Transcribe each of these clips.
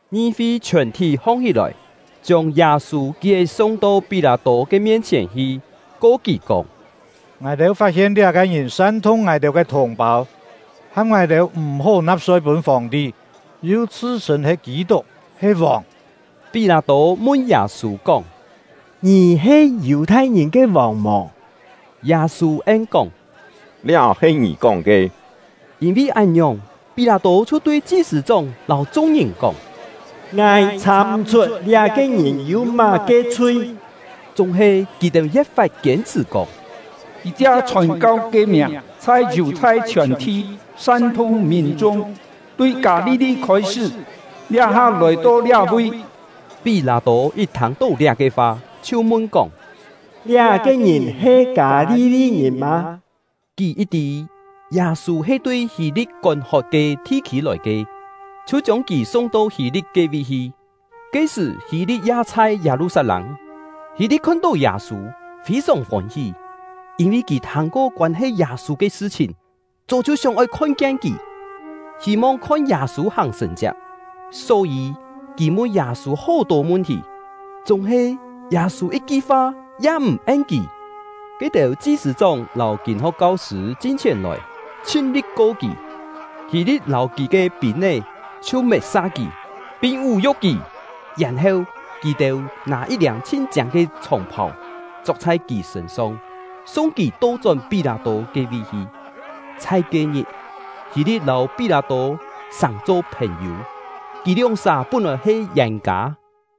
Ngi-fi chhiòn-thí hong-hí-lòi, chiông Yâ-sû kié-sung to Pí-lâ-tô ke mien-chhièn hi, ko kì kóng: “Ngài-têu fat-hien liá-ke ngìn san-thung ngài-têu ke thùng-pâu, ham ngài-têu m̀-hó na̍p-soi pûn Fòng-ti, yu chhṳ-chhṳ̂n he Kî-tuk, he vòng.” Pí-lâ-tô mun Yâ-sû kóng: “Ngì he Yù-thai-ngìn ke vòng mò?” Yâ-sû en-kóng: “Liá he ngì kóng ke.” Yîn-vi án-ngiòng, Pí-lâ-tô chhiu tui chi-sṳ̂-chóng lâu chung-ngìn kóng: “Ngài chhà-m̀-chhut liá-ke ngìn yû má-ke chhui.” Chúng-he, kì-têu ye̍t fat kiên-chhṳ̀ kóng: “Kì chia chhòn-kau ke miàng, chhai Yù-thai chhiòn-thi san-thung mìn-chung, tui Kâ-li-li khôi-sṳ́, liá-ha lòi-to liá-vi.” Pí-lâ-tô yit thâng-tó liá-ke fa, chhiu mun-kóng: “Liá-ke ngìn he Kâ-li-li-ngìn mâ?” Kì yit tî Yâ-sû he tui Hî-li̍t kón-hot ke thi-khî lòi ke, chhiu chiông kì sung-to Hî-li̍t ke-vi hi. (Ke-sṳ̀, Hî-li̍t ya chhai Yâ-lu-sat-lâng.) Hî-li̍t khon-tó Yâ-sû, fî-sòng fôn-hí; yîn-vi kì thâng-ko koân-he Yâ-sû ke sṳ-chhìn, chó chhiu sióng-oi kien kì, hî-mong khon Yâ-sû hàng sṳ̀n-chiak. Só-yî, kì mun Yâ-sû hó-tô mun-thì, chúng-he Yâ-sû yit-ki fa ya m̀ en kì. Ke-têu chi-sṳ̂-chóng lâu kîn-ho̍k kau-sṳ̂ chin-chhièn lòi, chhin-li̍t ko kì. Hî-li̍t lâu kì ke pîn-é chhiu met-sa kì, pin vú-yu̍k kì. Yèn-heu, kì-têu nâ yit-liâng chhin chiâng ke chhòng-phàu chok chhai kì sṳ̂n-song, sung kì to-chón Pí-lâ-tô ke-vi hi. Chhai ke-ngit, Hî-li̍t lâu Pí-lâ-tô sàng-cho phèn-yû; kì lióng-sà pún-lòi he yên-kâ.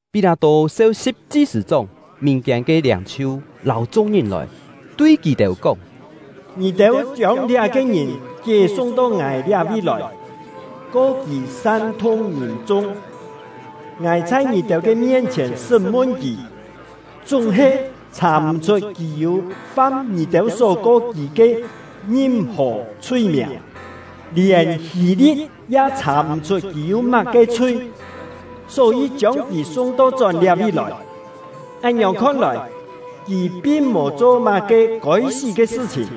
Pí-lâ-tô seu-si̍p chi-sṳ̂-chóng, mìn-kiên ke liâng-chhiu, lâu chung-ngìn lòi, tui kì-têu kóng: “Ngì-têu chiông liá-ke ngìn kié-sung to ngài liá-vi lòi, ko kì san-thung mìn-chung; ngài chhai ngì-têu ke mien-chhièn sṳ́m-mun kì, chúng-he chhà-m̀-chhut kì yû fam ngì-têu só ko kì ke ngim-hò chhui-miàng. Lièn Hî-li̍t ya chhà-m̀-chhut kì yû má-ke chhui, só-yî chiông kì sung-to-chón liá-vi lòi. Án-ngiòng khon-lòi, kì pin mò cho má-ke kôi-sí ke sṳ-chhìn.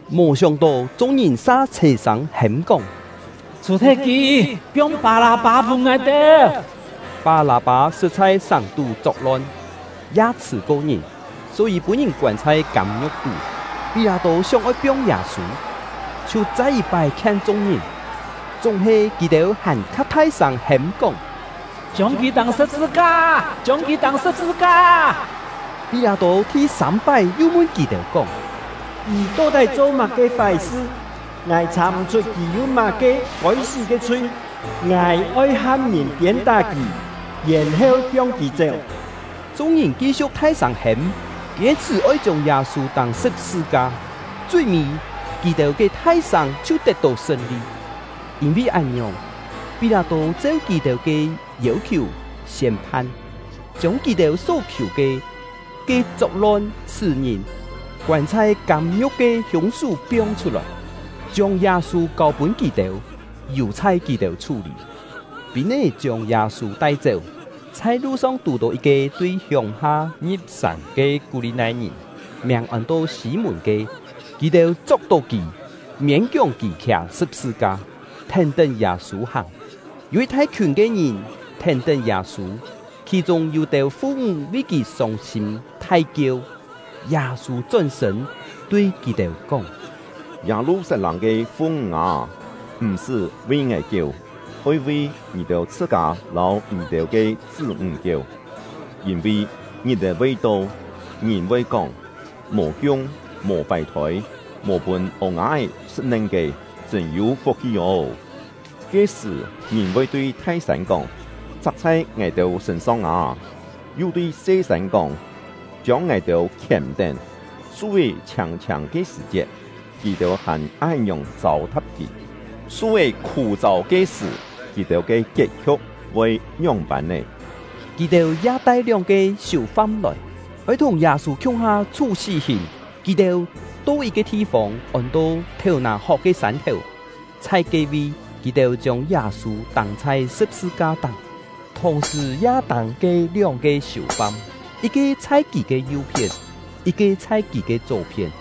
Mò sióng-tó, chung-ngìn sa chhè-sâng hêm-kóng: “Chhù-thet kì! Piong Pâ-lâ-pâ pûn ngài-têu!” (Pâ-lâ-pâ sṳt chhai sàng-tú chok-lon, ya chhṳ̀-ko ngìn, só-yî pûn-ngìn koân chhai kâm-ngiu̍k tú.) Pí-lâ-tô sióng-oi piong Yâ-sû, chhiu chai yit-pái khien chung-ngìn. Chúng-he kì-têu hàn-kha thai-sâng hêm-kóng: “Chiông kì tâng sṳ̍p-sṳ-ka! Chiông kì tâng sṳ̍p-sṳ-ka!” Pí-lâ-tô thi-sâm-pái yu mun kì-têu kóng: “Kì to-tái cho má-ke fái-sṳ? Ngài chhà-m̀-chhut kì yû má-ke kôi-sí ke chhui. Ngài oi ham ngìn piên-tá kì, yèn-heu piong kì chéu.” Chung-ngìn ki-siu̍k thai-sâng hêm, kiên-chhṳ̀ oi chiông Yâ-sû tâng sṳ̍p-sṳ-ka; chui-mî, kì-têu ke thai-sâng chhiu tet-tó sṳn-li. Yîn-vi án-ngiòng, Pí-lâ-tô cheu kì-têu ke yêu-khiù siên-phan, chiông kì-têu só-khiù ke, ke chok-lon chhṳ̀-ngìn, koân chhai kâm-ngiu̍k ke hiûng-sú, piong chhut-lòi, chiông Yâ-sû kâu-pûn kì-têu, yù-chhai kì-têu chhú-lî. Pîn-é chiông Yâ-sû tai-chéu, chhai lu-song tù-tó yit-ke tui hiông-ha ngi̍p-sàng ke Kú-li-nai-ngìn, miàng ôn-to Sî-mùn ke; kì-têu chok-tó kì, miên-kióng kì khià sṳ̍p-sṳ-ka, thèn-tén Yâ-sû hàng. Yû yit thai-khiùn ke ngìn thèn-tén Yâ-sû, khì-chûng yû-têu fu-ńg vi kì sông-sîm thai-kieu. Yâ-sû chón-sṳ̂n, tui kì-têu kóng: “Yâ-lu-sat-lâng ke fu-ńg â, m̀-sṳ́ vi ngài kieu, oi vi ngì-têu chhṳ-kâ lâu ngì-têu ke chṳ́-ńg kieu! Yîn-vi ngit-è voi to, ngìn voi kóng: ‘Mò kiung, mò fài-thôi, mò pûn ô-nga-é sṳ̍t-nen ke, chṳ̂n-yû fuk-hi ô!’ Ke-sṳ̀, ngìn voi tui thai-sân kóng: ‘Chak chhai ngài-têu sṳ̂n-song â!’ yu tui se-sân kóng: ‘Chiông ngài-têu khièm-tén!’ Su-é chhiâng-chhiâng ke sṳ̀-chiet, kì-têu hàn án-ngiòng châu-tha̍p kì, su-é khû-châu ke sṳ̀, kì-têu ke kiet-khiu̍k voi ngióng-pân nè?” Kì-têu ya tai lióng-ke siù-fam lòi, oi thùng Yâ-sû khiung-ha chhú sí-hìn. Kì-têu to yit-ke thi-fông, ôn-to “Thèu-nà-hok ke Sân-thèu”, chhai ke-vi, kì-têu chiông Yâ-sû tâng chhai sṳ̍p-sṳ-ka-táng, thùng-sṳ̀ ya tâng ke lióng-ke siù-fam, yit-ke chhai kì ke yu-phién, yit-ke chhai kì ke chó-phién.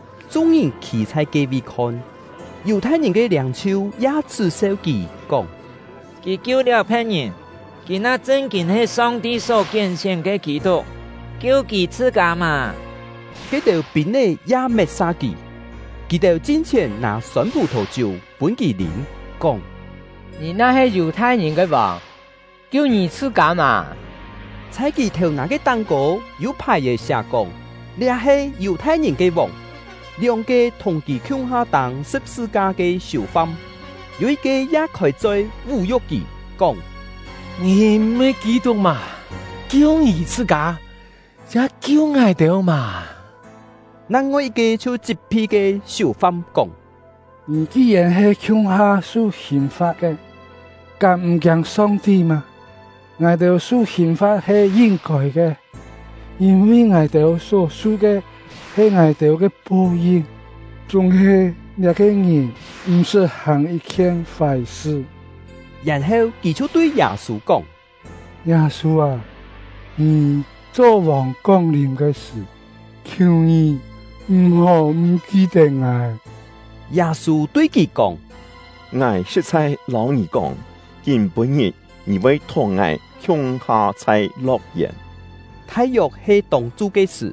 Chung-ngìn khî chhai ke-vi khon. Yù-thai-ngìn ke liâng-chhiu ya chhṳ́-seu kì, kóng: “Kì kiu-liáu phe̍t-ngìn! Kì na chṳn-kîn he Song-ti só kién-sién ke Kî-tuk, kiu kì chhṳ-kâ mà!” Ke-têu pîn-é ya met-sa kì. Kì-têu chin-chhièn nâ sôn phù-thò-chiú pûn kì lîm, kóng: “Ngì na-he Yù-thai-ngìn ke vòng, kiu ngì chhṳ-kâ mà!” Chhai kì thèu-nà ke táng-kô yû phài-è siá-kóng: “Liá he Yù-thai-ngìn ke vòng.” Lióng-ke thùng kì khiung-ha tâng sṳ̍p-sṳ-ka ke siù-fam, yû yit-ke ya khôi-choi vú-yu̍k kì, kóng: “Ngì m̀-he Kî-tuk mâ? Kiu ngì chhṳ-kâ, ya kiu ngài-têu mà!” Nang-ngoi yit-ke chhiu chit-phi ke siù-fam, kóng: “Ngì ki-yèn he khiung-ha su hìn-fa̍t ke, kám m̀ kiâng Song-ti mâ? Ngài-têu su hìn-fa̍t he yin-kôi ke, yîn-vi ngài-têu só-su ke he ngài-têu ke po-yin; chúng-he liá-ke ngìn m̀-sṳt hàng yit-khien fái-sṳ.” Yèn-heu kì chhiu tui Yâ-sû kóng: “Yâ-sû â, ngì cho vòng kong-lìm ke sṳ̀, khiù ngì m̀-hó m̀ ki-tet ngài!” Yâ-sû tui kì kóng: “Ngài sṳ̍t-chhai lâu ngì kóng, kîm-pû-ngit ngì voi thùng ngài khiung-ha chhai lo̍k-yèn!” Thai-yok he tông-chu ke sṳ̀,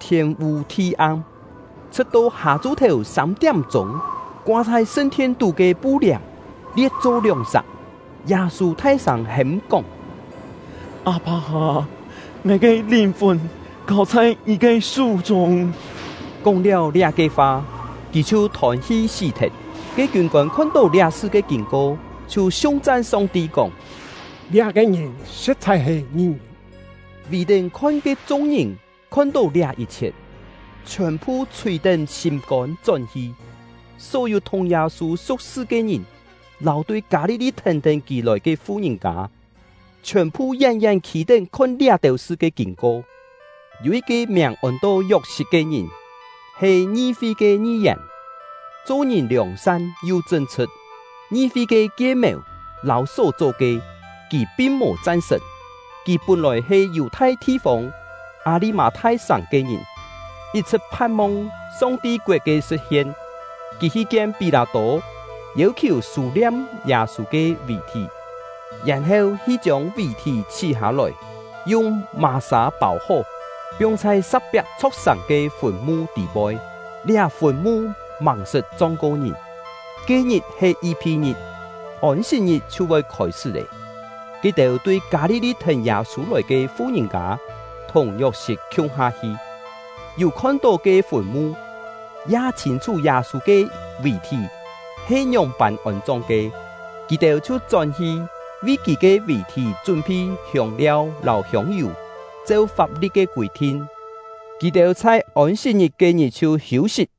thiên-vû thi-am, chhṳ̍t-to hâ-chu-thèu sâm-tiám-chûng. Koa chhai sṳn-thien-tú ke pu-liàm lie̍t-cho lióng-sak. Yâ-sû thai-sâng hêm-kóng: “Â-pâ â, ngài ke lìn-fùn kâu chhai Ngì ke sú-chûng!” Kóng-liáu liá-ke fa, kì chhiu thôn-hi sí-thet. Ke kiûn-kôn khon-tó liá-sṳ ke kîn-ko, chhiu siung-chan Song-ti kóng: “Liá-ke ngìn sṳ̍t-chhai he ngi-ngìn!” Vì-tén khon ke chung-ngìn khon-tó liá yit-chhiet, chhiòn-phu chhùi-tén sîm-kôn chón-hi. Só-yû thùng Yâ-sû su̍k-sṳ ke ngìn, lâu tui Kâ-li-li thèn-tén kì lòi ke fu-ngìn-kâ, chhiòn-phu yén-yén khî-tén khon liá-têu sṳ ke kîn-ko. Yû yit-ke miàng ôn-to Yok-sit ke ngìn, he ngi-fi ke ngi-yèn, cho-ngìn liòng-san yu chṳn-chhṳ̍t; ngi-fi ke kie-mèu lâu só-cho ke, kì pin mò chan-sṳ̀n. Kì pún-lòi he Yù-thai thi-fông Â-li-mâ-thai-sàng ke ngìn, yit-chhṳ̍t phan-mong Song-ti koet ke sṳ̍t-hien. Kì hi kien Pí-lâ-tô, yêu-khiù sû-liam Yâ-sû ke vì-thí, yèn-heu hi chiông vì-thí chhí-hâ-lòi, yung mà-sâ pâu-hó, piong chhai sa̍k-piak chho̍k-sàng ke fùn-mu tî-poi; liá fùn-mu màng-sṳt chong-ko ngìn. Ke-ngit he Yi-phi-ngit, Ôn-sit-ngit chhiu voi khôi-sṳ́ lé. Ke-têu tui Kâ-li-li thèn Yâ-sû lòi ke fu-ngìn-kâ thùng Yok-sit khiung-ha hi, yû khon-tó ke fùn-mu, ya chhîn-chhú Yâ-sû ke vì-thí he ngióng-pân ôn-chong ke. Kì-têu chhiu chón-hi, vi kì ke vì-thí chún-phi hiông-liau lâu hiông-yù. Cheu fap-li̍t ke kûi-thin, kì-têu chhai Ôn-sit-ngit ke-ngit chhiu hiû-sit.